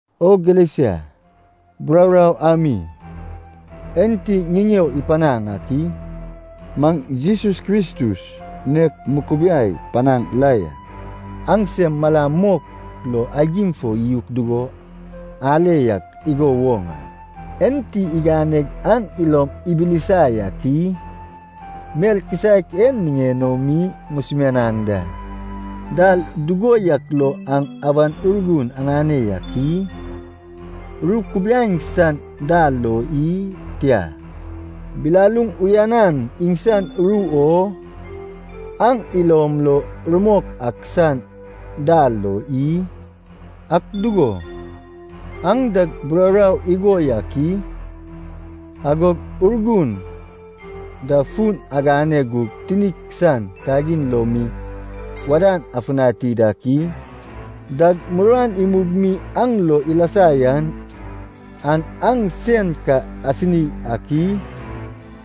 O Galesia, bururau ami enti ŋiŋeo ipanaŋ ak i? Maŋ Jesus Kristus nek mukubiai panaŋ la ya. Aŋsem malam mok lo aigim fo iyuk dugo ale yak igo woŋ a. Enti iganeg aŋ ilom ibilisa yak i? Mel kisaek en niŋen o mi ŋusumianaŋ da. Dal dugo yak lo aŋ Awan Urgun aŋane yak i? Ru kubiaeŋ san dal lo i? Tia, bilaluŋ uyanan iŋsan ru o aŋ ilom lo rumok ak san dal lo i? Ak dugo, aŋ dag bururau igo yak i? Agog Urgun da fun agane gug tinik san kagin lo mi wadan afutani dak i? Dag muruan imug mi aŋ lo ilasa yan, an aŋ sen ka asini ak i?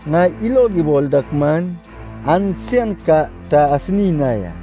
Ŋai ilog ibol dak man, an sen ka ta asini na ya!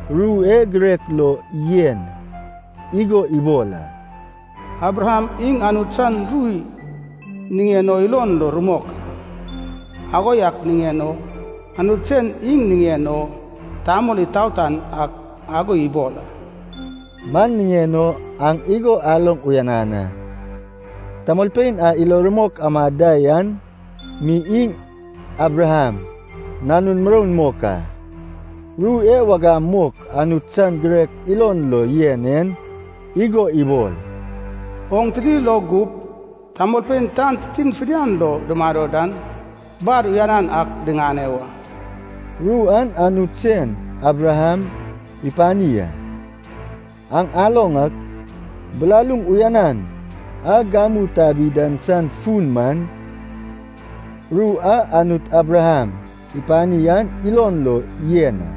Ru e girek lo yen igo ibol a. “Abraham iŋ Anut san ru niŋen o ilon rumok a. Ago yak niŋen o Anut sen iŋ niŋen o tamol itaotan ak ago ibol a.” Man niŋen o aŋ igo aloŋ uyanan a, tamolpein a ilo rumok amad da yan mi iŋ Abraham nanun muroun mok a. Ru e wagam mok Anut san girek ilon lo yen en igo ibol, “Oŋ tini lo gup tamolpein tan titin fidian lo dumado dan bar uyanan ak diŋane wa.” Ru an Anut sen Abraham ipani a. Aŋ aloŋ ak, bilaluŋ uyanan a gamu tabi dan san fun man, ru a Anut Abraham ipani an ilon lo yen a.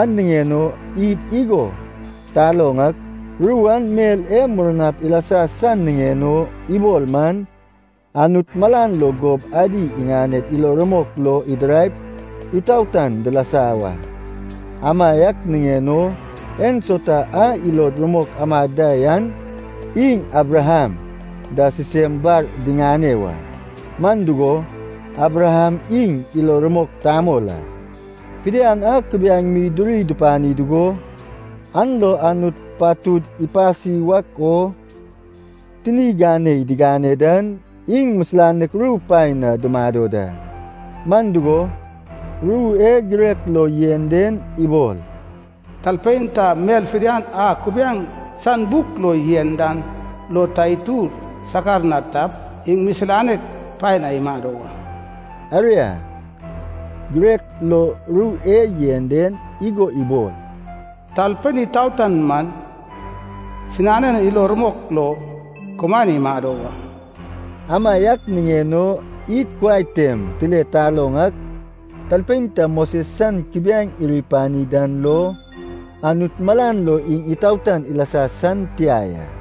An niŋen o id igo taloŋ ak, ru an mel e murnap ilasa san niŋen o ibol man, Anut malan lo gob adi iŋaned ilo rumok lo idiraip itaotan dilasa wa. Amaiak niŋen o ensauta a ilo rumok amad da yan iŋ Abraham da sisem bar diŋane wa, man dugo, Abraham iŋ ilo rumok tamol a. Fidian a kubiaeŋ mi duri dupani dugo, an lo Anut patud ipasi wak o tini ganei digane dan, iŋ misilanek ru paen na dumado da. Man dugo, ru e girek lo yen den ibol, “Talpein ta mel fidian a kubiaeŋ san buk lo yen dan lo ta itur sakar na tap, iŋ misilanek paen na imado wa.” Aria, girek lo ru e yen den igo ibol, “Talpein itaotan man sinanen ilo rumok lo kumaen imado wa.” Amaiak niŋen o id kuai tem tile taloŋ ak, talpein ta Moses san kubiaeŋ iri ipani dan lo, Anut malan lo iŋ itaotan ilasa san tia ya.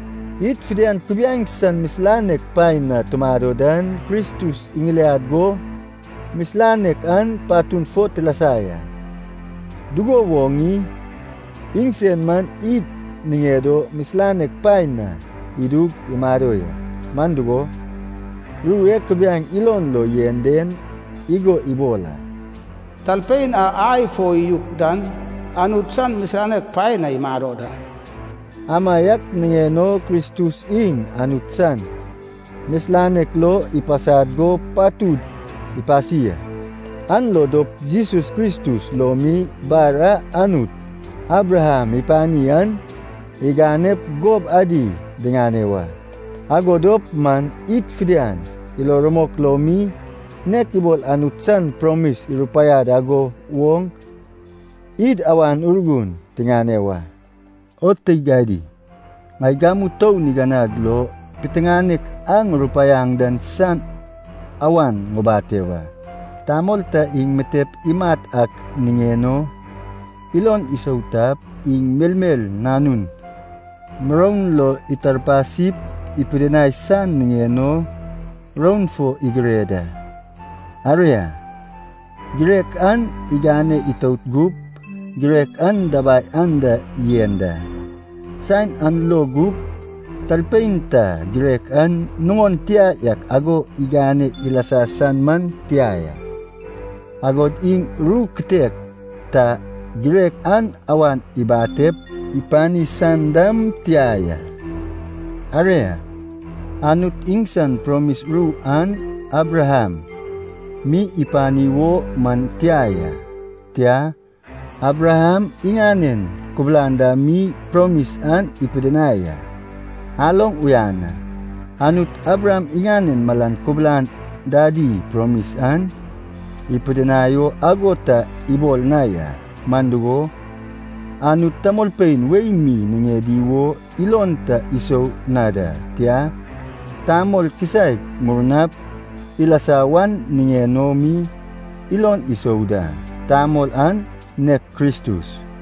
Id fidian kubiaeŋ san misilanek paen na tumado dan, Kristus iŋiliad go misilanek an patun fo tilasa ya. Dugo woŋ i? Iŋsen man id niŋed o misilanek paen na idug imado ya. Man dugo, ru e kubiaeŋ ilon lo yen den igo ibol a. “Talpein a ai fo iyuk dan Anut san misilanek paen na imado da.” Amaiak niŋen o Kristus iŋ Anut san misilanek lo ipasad go patud ipasi a. An lo dop Jesus Kristus lo mi bar a Anut Abraham ipani an iganep gob adi diŋane wa. Ago dop man id fidian, ilo rumok lo mi, nek ibol Anut san promis irupaiad ago woŋ, id Awan Urgun tiŋane wa. O teig adi, ŋai gamu tou niganag lo piteŋanek a ŋurupaiaŋ dan san awan ŋubate wa. Tamol ta iŋ mitep imat ak niŋen o ilon isou tap, iŋ melmel nanun muroun lo itarpasip ipidinai san niŋen o, roun fo igire da. Aria, girek an igane itout gup girek an dabai anda yen da. Saen an lo gup, talpein ta girek an nuŋon tia yak ago igane ilasa san man tia ya. Agod iŋ ru kitek ta girek an awan ibatep ipani san dam tia ya. Aria, Anut iŋsan promis ru an Abraham mi ipani wo man tia ya, tia, Abraham iŋanen kubulan da mi promis an ipidinai a. Aloŋ uyan a. Anut Abraham iŋanen malan kubulan dadi promis an ipidinai o ago ta ibol na ya. Man dugo, Anut tamolpein wei mi niŋedi wo ilon ta isou na da, tia, tamol kisaek murnap ilasa wan niŋen o mi ilon isou da. Tamol an nek Kristus.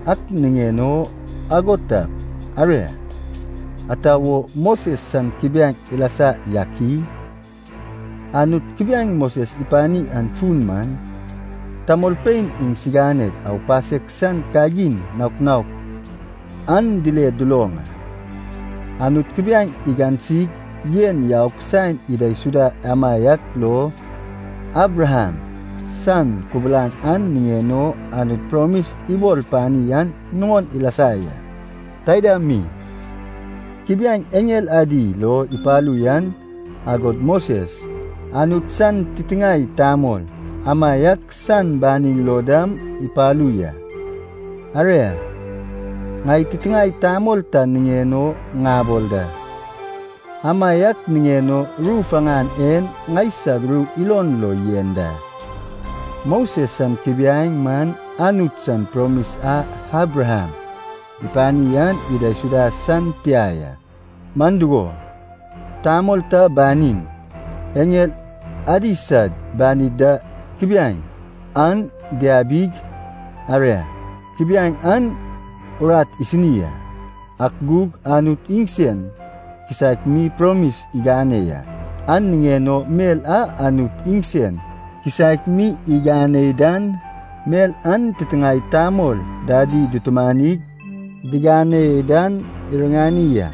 Ak niŋen o ago tap, aria, ata wo Moses san kubiaeŋ ilasa yak i? Anut kubiaeŋ Moses ipani an fun man, tamolpein iŋsiŋaned aupasek san kagin naok naok an dile duloŋ a. Anut kubiaeŋ igansig yen yaug saen idaisuda amaiak lo, Abraham san kubulan a niŋen o Anut promis ibol pani an nuŋon ilasa ya. Taida mi, kubiaeŋ eŋel adi lo ipalu yan, agod Moses, Anut san titiŋae tamol, amaiak san banin lo dam ipalu ya. Aria, ŋai titiŋae tamol ta niŋen o ŋabol da, amaiak niŋen o ru faŋan en ŋaisag ru ilon lo yen da. Moses san kubiaeŋ man Anut san promis a Abraham ipani an idaisuda san tia ya, man dugo, tamol ta banin, eŋel adi sad banid da kubiaeŋ an diabig, aria, kubiaeŋ an urat isini a. Ak gug Anut iŋsen kisaek mi promis igane ya, an niŋen o mel a Anut iŋsen kisaek mi iganei dan, mel an titiŋae tamol dadi dutumanig diganei dan iriŋani a.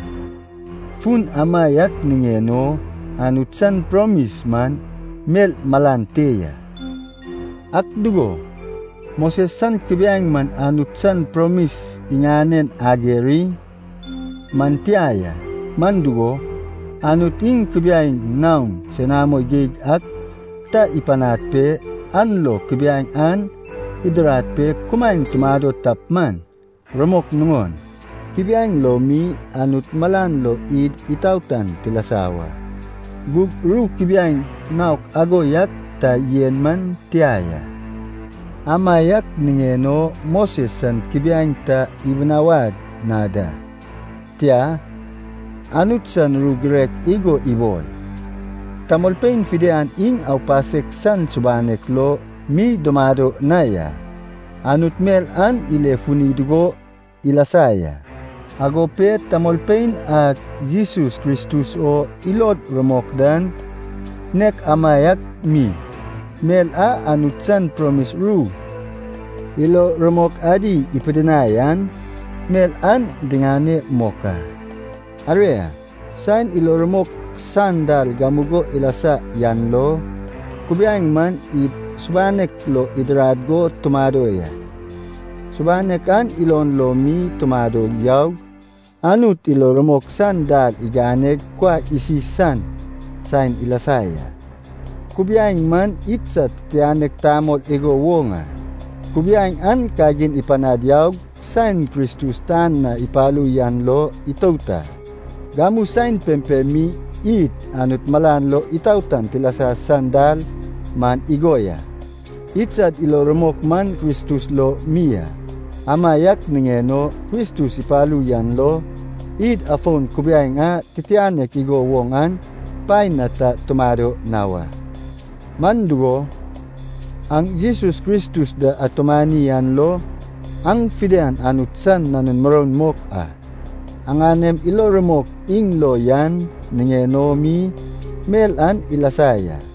Fun amaiak niŋen o Anut san promis man mel malan te ya. Ak dugo, Moses san kubiaeŋ man Anut san promis iŋanen ager i? Man tia ya. Man dugo, Anut iŋ kubiaeŋ naon senamo geig ak ta ipanad pe, an lo kubiaeŋ an idirad pe kumaen tumado tap man, rumok nuŋon, kubiaeŋ lo mi Anut malan lo id itaotan tilasa wa. Gug ru kubiaeŋ naok ago yak ta yen man tia ya. Amaiak niŋen o Moses san kubiaeŋ ta ibinawad na da. Tia, Anut san ru girek igo ibol, tamolpein fidian iŋ aupasek san subanek lo mi dumado na ya. Anut mel an ile funi dugo ilasa ya. Ago pe tamolpein a Jesus Kristus o ilod rumok dan nek amaiak mi, mel a Anut san promis ru ilo rumok adi ipidinai an, mel an diŋane mok a. Aria, saen ilo rumok san dal gamugo ilasa yan lo, kubiaeŋ man id subanek lo idirad go tumado ya. Subanek an ilon lo mi tumado yaug Anut ilo rumok san dal iganeg kuai isi san saen ilasa ya. Kubiaeŋ man idsad titianek tamol igo woŋ a, kubiaeŋ an kagin ipanad yaug saen Kristus tan na ipalu yan lo itout a. Gamu saen pempem mi id Anut malan lo itaotan tilasa san dal man igo ya, idsad ilo rumok man Kristus lo mi a. Amaiak niŋen o Kristus ipalu yan lo, id afon kubiaeŋ a titianek igo woŋ an paen na ta tumado na wa. Man dugo, aŋ Jesus Kristus da atumani an lo aŋ fidian Anut san nanun muroun mok a. Aŋanem ilo rumok iŋ lo yan niŋen o mi mel an ilasa ya.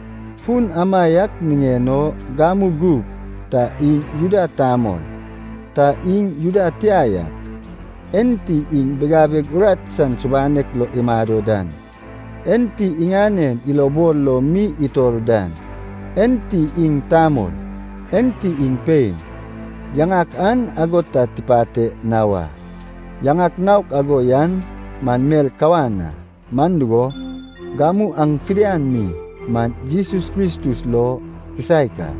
Fun amaiak niŋen o gamu gup ta iŋ Juda tamol, ta iŋ Juda tia yak, enti iŋ bigabeg urat san subanek lo imado dan, enti iŋanen ilobol lo mi itor dan, enti iŋ tamol, enti iŋ pein, yaŋak an ago ta tipate na wa. Yaŋak naok ago yan man mel kawan a. Man dugo, gamu aŋ fidian mi man Jesus Kristus lo kisaek a.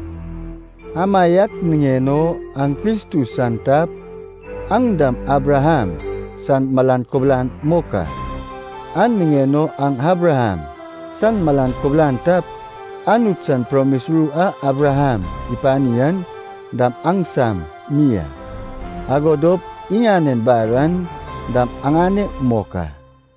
Amaiak niŋen o aŋ Kristus san tap, aŋ dam Abraham san malan kubulan mok a. An niŋen o aŋ Abraham san malan kubulan tap, Anut san promis ru a Abraham ipani an dam aŋsam mi a, ago dop iŋanen bar aŋ dam aŋane mok a.